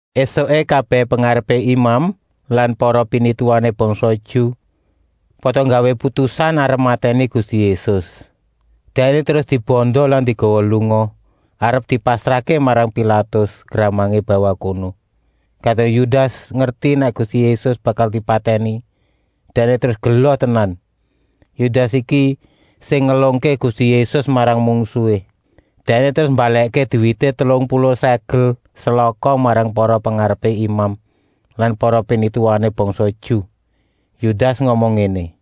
Esuké kabèh pengarepé imam lan para pinituwané bangsa Ju pada nggawé putusan arep matèni Gusti Yésus. Dèkné terus dibanda lan digawa lunga, arep dipasrahké marang Pilatus, gramangé bawah kono. Kadung Yudas ngerti nèk Gusti Yésus bakal dipatèni, dèkné terus gela tenan. Yudas iki sing ngelungké Gusti Yésus marang mungsuhé. Dèkné terus mbalèkké duwité telung puluh sèkel selaka marang para pengarepé imam lan para pinituwané bangsa Ju. Yudas ngomong ngéné: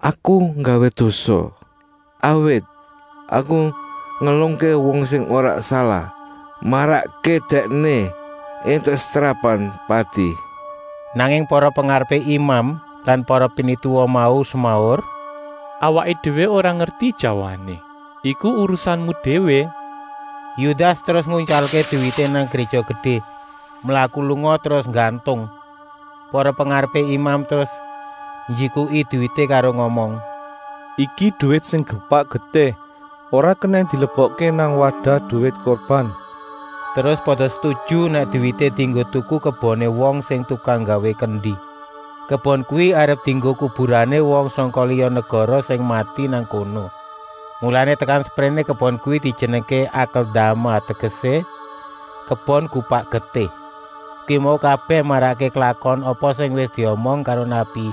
“Aku nggawé dosa, awit aku ngelungké wong sing ora salah, marakké Dèkné éntuk setrapan pati.” Nanging para pengarepé imam lan para pinituwa mau semaur: “Awaké déwé ora ngerti jawané, iku urusanmu déwé.” Yudas terus nguntyalké duwité nang Gréja Gedé, mlaku lunga terus nggantung. Para pengarepé imam terus njikuki duwité karo ngomong: “Iki duwit sing gupak getih, ora kenèng dilebokké nang wadah duwit kurban.” Terus pada setuju nèk duwité dienggo tuku keboné wong sing tukang nggawé kendi. Kebon kuwi arep dienggo kuburané wong sangka liya negara sing mati nang kono. Mulané tekan sepréné kebon kuwi dijenengké Akeldama, tegesé: kebon gupak getih. Kuwi mau kabèh marakké klakon apa sing wis diomong karo nabi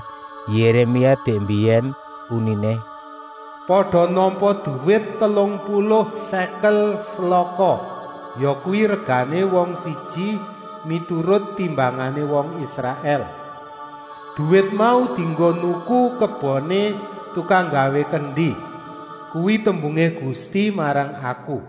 Yéremia dèk mbiyèn, uniné: “Pada nampa duwit telung puluh sèkel selaka, yakuwi regané wong siji miturut timbangané wong Israèl. Duwit mau dienggo nuku keboné tukang nggawé kendi. Kuwi tembungé Gusti marang aku.”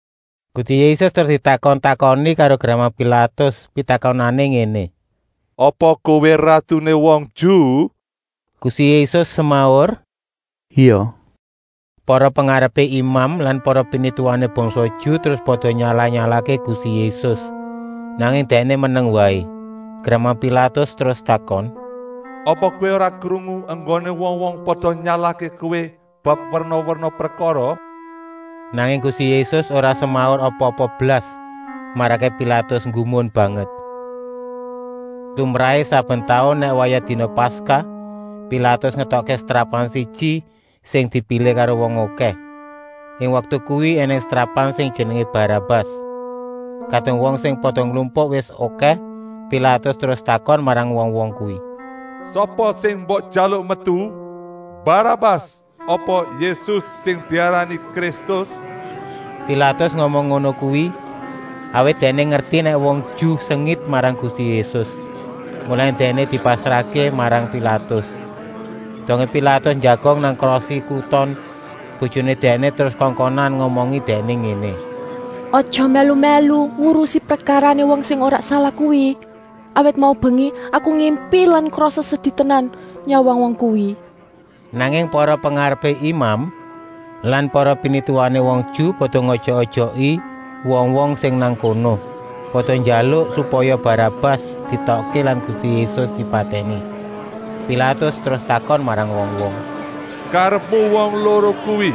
Gusti Yésus terus ditakon-takoni karo gramang Pilatus. Pitakonané ngéné: “Apa Kowé ratuné wong Ju?” Gusti Yésus semaur: “Ya, kuwi bener.” Para pengarepé imam lan para pinituwané bangsa Ju terus pada nyalah-nyalahké Gusti Yésus, nanging Dèkné meneng waé. Gramang Pilatus terus takon: “Apa Kowé ora krungu enggoné wong-wong pada nyalahké Kowé bab werna-werna prekara?” Nanging Gusti Yésus ora semaur apa-apa blas, marakké Pilatus nggumun banget. Lumrahé, saben taun nèk wayah dina Paskah, Pilatus ngetokké setrapan siji, sing dipilih karo wong okèh. Ing waktu kuwi ènèng setrapan sing jenengé Barabas. Kadung wong sing pada nglumpuk wis okèh, Pilatus terus takon marang wong-wong kuwi: “Sapa sing mbok jaluk metu: Barabas apa Yésus sing diarani Kristus?” Pilatus ngomong ngono kuwi, awit dèkné ngerti nèk wong Ju sengit marang Gusti Yésus, mulané Dèkné dipasrahké marang Pilatus. Dongé Pilatus njagong nang krosi kruton, bojoné dèkné terus kongkonan ngomongi dèkné ngéné: “Aja mèlu-mèlu ngurusi prekarané wong sing ora salah kuwi. Awit mau mbengi aku ngimpi lan krasa sedi tenan nyawang wong kuwi.” Nanging para pengarepé imam lan para pinituwané wong Ju pada ngojok-ojoki wong-wong sing nang kono, pada njaluk supaya Barabas dietokké lan Gusti Yésus dipatèni. Pilatus terus takon marang wong-wong: “Karepmu wong loro kuwi,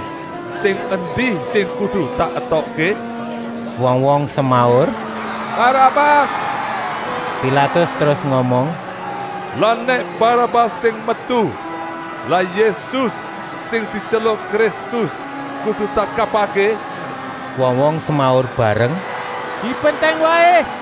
sing endi sing kudu tak etokké?” Wong-wong semaur: “Barabas!” Pilatus terus ngomong: “Lah nèk Barabas sing metu, lah Yésus, sing dityeluk Kristus, kudu tak kapakké?” Wong-wong semaur bareng: “Dipentèng waé!”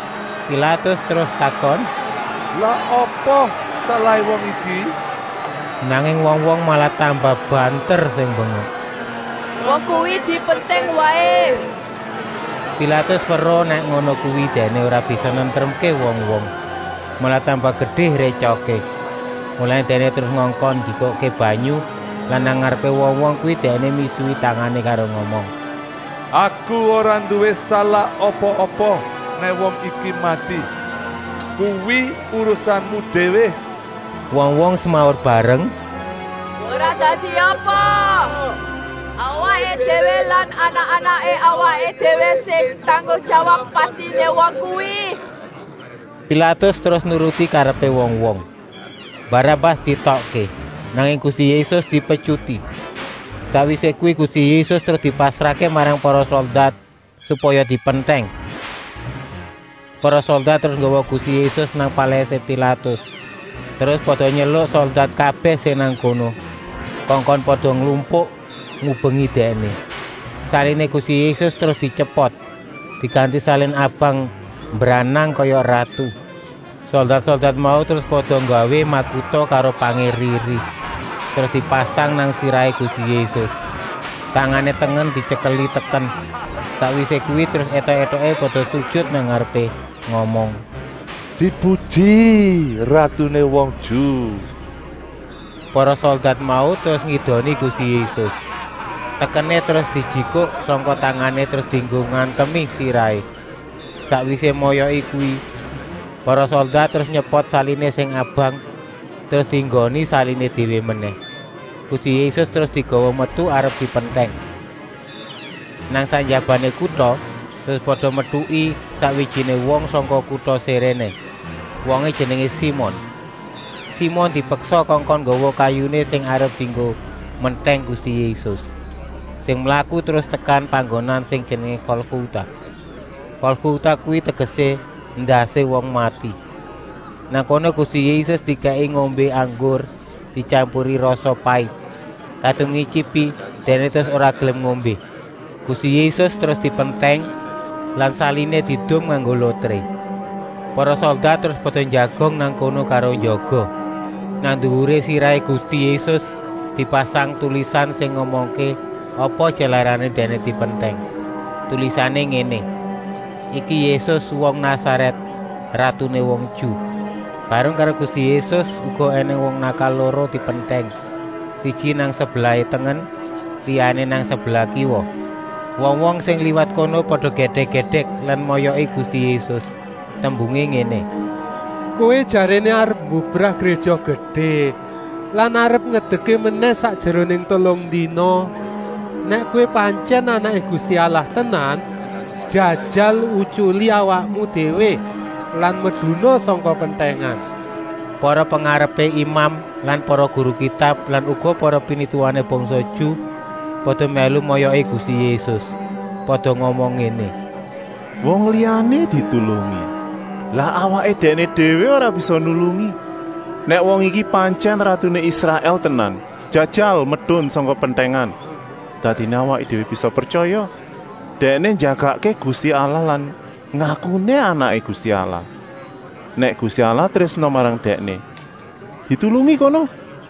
Pilatus terus takon: “Lah apa salahé wong iki?” Nanging wong-wong malah tambah banter sing mbengok: “Wong kuwi dipentèng waé!” Pilatus weruh nèk ngono kuwi dèkné ora bisa nentremké wong-wong, malah tambah gedé rétyokké. Mulané dèkné terus ngongkon njikukké banyu lan nang ngarepé wong-wong kuwi dèkné misuhi tangané karo ngomong: “Aku ora nduwé salah apa-apa nèk wong iki mati. Kuwi urusanmu déwé!” Wong-wong semaur bareng: “Ora dadi apa, awaké déwé lan anak-anaké awaké déwé sing tanggung jawab patiné wong kuwi!” Pilatus terus nuruti karepé wong-wong. Barabas dietokké, nanging Gusti Yésus dipetyuti. Sakwisé kuwi Gusti Yésus terus dipasrahké marang para soldat supaya dipentèng. Para soldat terus nggawa Gusti Yésus nang palèsé Pilatus, terus pada nyeluk soldat kabèh sing nang kono, kongkon pada nglumpuk ngubengi Dèkné. Saliné Gusti Yésus terus dityepot, diganti salin abang mbranang kaya ratu. Soldat-soldat mau terus pada nggawé makuta karo pangé eri-eri, terus dipasang nang sirahé Gusti Yésus. Tangané tengen dityekeli teken. Sakwisé kuwi terus étok-étoké pada sujut nang ngarepé, ngomong: “Dipuji ratuné wong Ju!” Para soldat mau terus ngidoni Gusti Yésus. Tekené terus dijikuk sangka tangané terus dienggo ngantemi sirahé. Sakwisé moyoki kuwi, para soldat terus nyepot saliné sing abang, terus dienggoni saliné déwé menèh. Gusti Yésus terus digawa metu arep dipentèng. Nang sak njabané kuta terus pada metuki sakwijiné wong sangka kuta Siréné. Wongé jenengé Simon. Simon dipeksa kongkon nggawa kayuné sing arep dienggo mentèng Gusti Yésus. Sing mlaku terus tekan panggonan sing jenengé Golgota. Golgota kuwi tegesé: endasé wong mati. Nang kono Gusti Yésus dikèki ngombé anggur dityampuri rasa pait. Kadung ngityipi, Dèkné terus ora gelem ngombé. Gusti Yésus terus dipentèng lan saliné diedum nganggo lotré. Para soldat terus pada njagong nang kono karo njaga. Nang nduwuré sirahé Gusti Yésus dipasang tulisan sing ngomongké apa jalarané Dèkné dipentèng. Tulisané ngéné: “Iki Yésus, wong Nasarèt, ratuné wong Ju.” Bareng karo Gusti Yésus uga ènèng wong nakal loro dipentèng, siji nang sebelah tengen, liyané nang sebelah kiwa. Wong-wong sing liwat kono pada gèdèk-gèdèk lan moyoki Gusti Yésus. Tembungé ngéné: “Kowé jaréné arep mbubrah Gréja Gedé lan arep ngedekké menèh sakjeroné telung dina. Nèk Kowé pantyèn Anaké Gusti Allah tenan, jajal utyuli awakmu déwé lan meduna sangka pentèngan!” Para pengarepé imam lan para guru Kitab lan uga para pinituwané bangsa Ju pada mèlu moyoki Gusti Yésus. Pada ngomong ngéné: “Wong liyané ditulungi, lah awaké dèkné déwé ora bisa nulungi! Nèk wong iki pantyèn ratuné Israèl tenan, jajal medun sangka pentèngan, dadiné awaké déwé bisa pretyaya. Dèkné njagakké Gusti Allah lan ngakuné Anaké Gusti Allah. Nèk Gusti Allah trésna marang Dèkné, ditulungi kono!”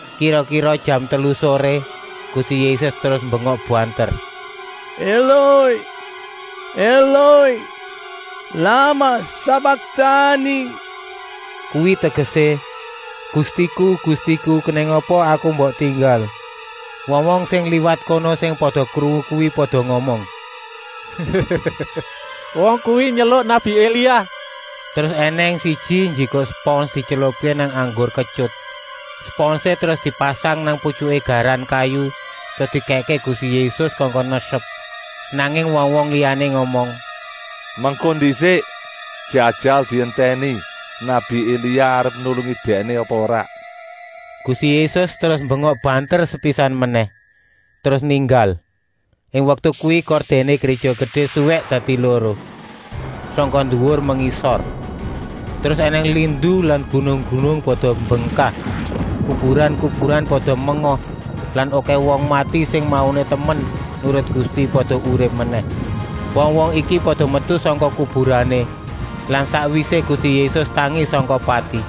Kira-kira jam telu soré Gusti Yésus terus mbengok banter: “Eloi, Eloi, lamah sabaktani!” Kuwi tegesé: “Gustiku, Gustiku, kenèng apa Aku kok mbok tinggal?” Wong-wong sing liwat kono sing pada krungu kuwi pada ngomong: “Wong kuwi nyeluk nabi Elia.” Terus ènèng siji njikuk spons dietylupké nang anggur ketyut. Sponsé terus dipasang nang putyuké garan kayu terus dikèkké Gusti Yésus kongkon nyesep. Nanging wong-wong liyané ngomong: “Mengko ndisik, jajal dientèni, nabi Elia arep nulungi Dèkné apa ora!” Gusti Yésus terus mbengok banter sepisan menèh, terus ninggal. Ing waktu kuwi kordèné Gréja Gedé suwèk dadi loro, sangka nduwur mengisor. Terus ènèng lindu lan gunung-gunung pada mbengkak. Kuburan-kuburan pada menga lan okèh wong mati sing mauné temen nurut Gusti, pada urip menèh. Wong-wong iki pada metu sangka kuburané lan sakwisé Gusti Yésus tangi sangka pati,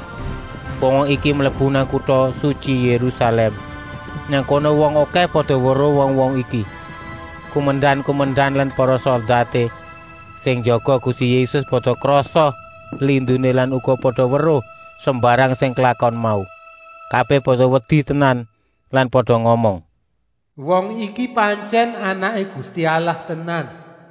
wong-wong iki mlebu nang Kuta Sutyi Yérusalèm. Nang kono wong okèh pada weruh wong-wong iki. Kumendan-kumendan lan para soldaté sing njaga Gusti Yésus pada krasa linduné lan uga pada weruh sembarang sing klakon mau. Kabèh pada wedi tenan lan pada ngomong: “Wong iki pantyèn Anaké Gusti Allah tenan.”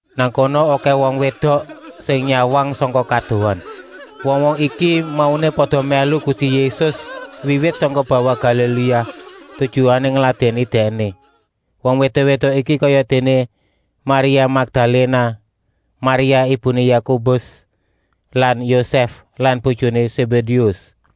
Nang kono okèh wong wédok sing nyawang sangka kadohan. Wong-wong iki mauné pada mèlu Gusti Yésus wiwit sangka bawah Galiléa, tujuané ngladèni Dèkné. Wong wédok-wédok iki kayadéné: Maria Makdaléna, Maria ibuné Yakobus lan Yosèf lan bojoné Sébédéus.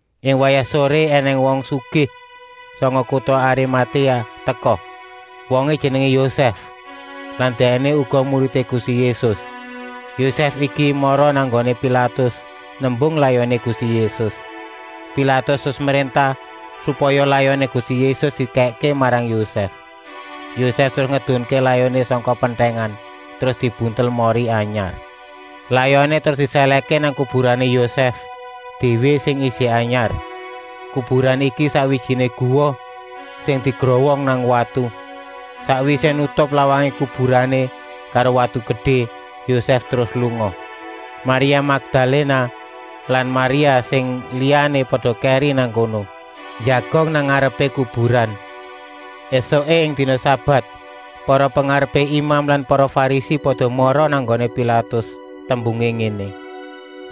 Ing wayah soré ènèng wong sugih sangka kuta Arimatéa teka. Wongé jenengé Yosèf lan dèkné uga muridé Gusti Yésus. Yosèf iki mara nang nggoné Pilatus nembung layoné Gusti Yésus. Pilatus terus mréntah supaya layoné Gusti Yésus dikèkké marang Yosèf. Yosèf terus ngedunké layoné sangka pentèngan, terus dibuntel mori anyar. Layoné terus disèlèhké nang kuburané Yosèf déwé sing ijik anyar. Kuburan iki sakwijiné guwa sing digrowong nang watu. Sakwisé nutup lawangé kuburané karo watu gedé, Yosèf terus lunga. Maria Makdaléna lan Maria sing liyané pada kèri nang kono, njagong nang ngarepé kuburan. Esuké, ing dina sabat, para pengarepé imam lan para Farisi pada mara nang nggoné Pilatus. Tembungé ngéné: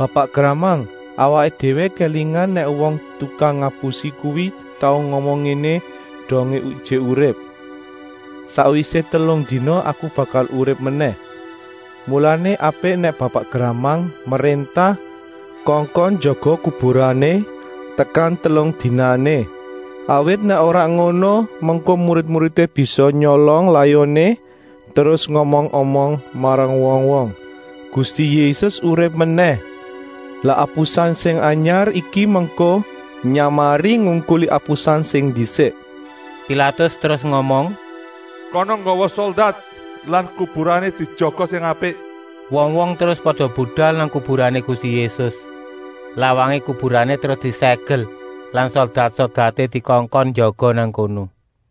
“Bapak gramang, awaké déwé kélingan nèk wong tukang ngapusi kuwi tau ngomong ngéné dongé ijik urip: ‘Sakwisé telung dina Aku bakal urip menèh.’ Mulané apik nèk bapak gramang mréntah kongkon njaga kuburané tekan telung dinané. Awit nèk ora ngono, mengko murid-muridé bisa nyolong layoné, terus ngomong-omong marang wong-wong: ‘Gusti Yésus urip menèh.’ Lah apusan sing anyar iki mengko nyamariné ngungkuli apusan sing ndisik.” Pilatus terus ngomong: “Kana nggawa soldat lan kuburané dijaga sing apik.” Wong-wong terus pada budal nang kuburané Gusti Yésus. Lawangé kuburané terus diségel lan soldat-soldaté dikongkon njaga nang kono.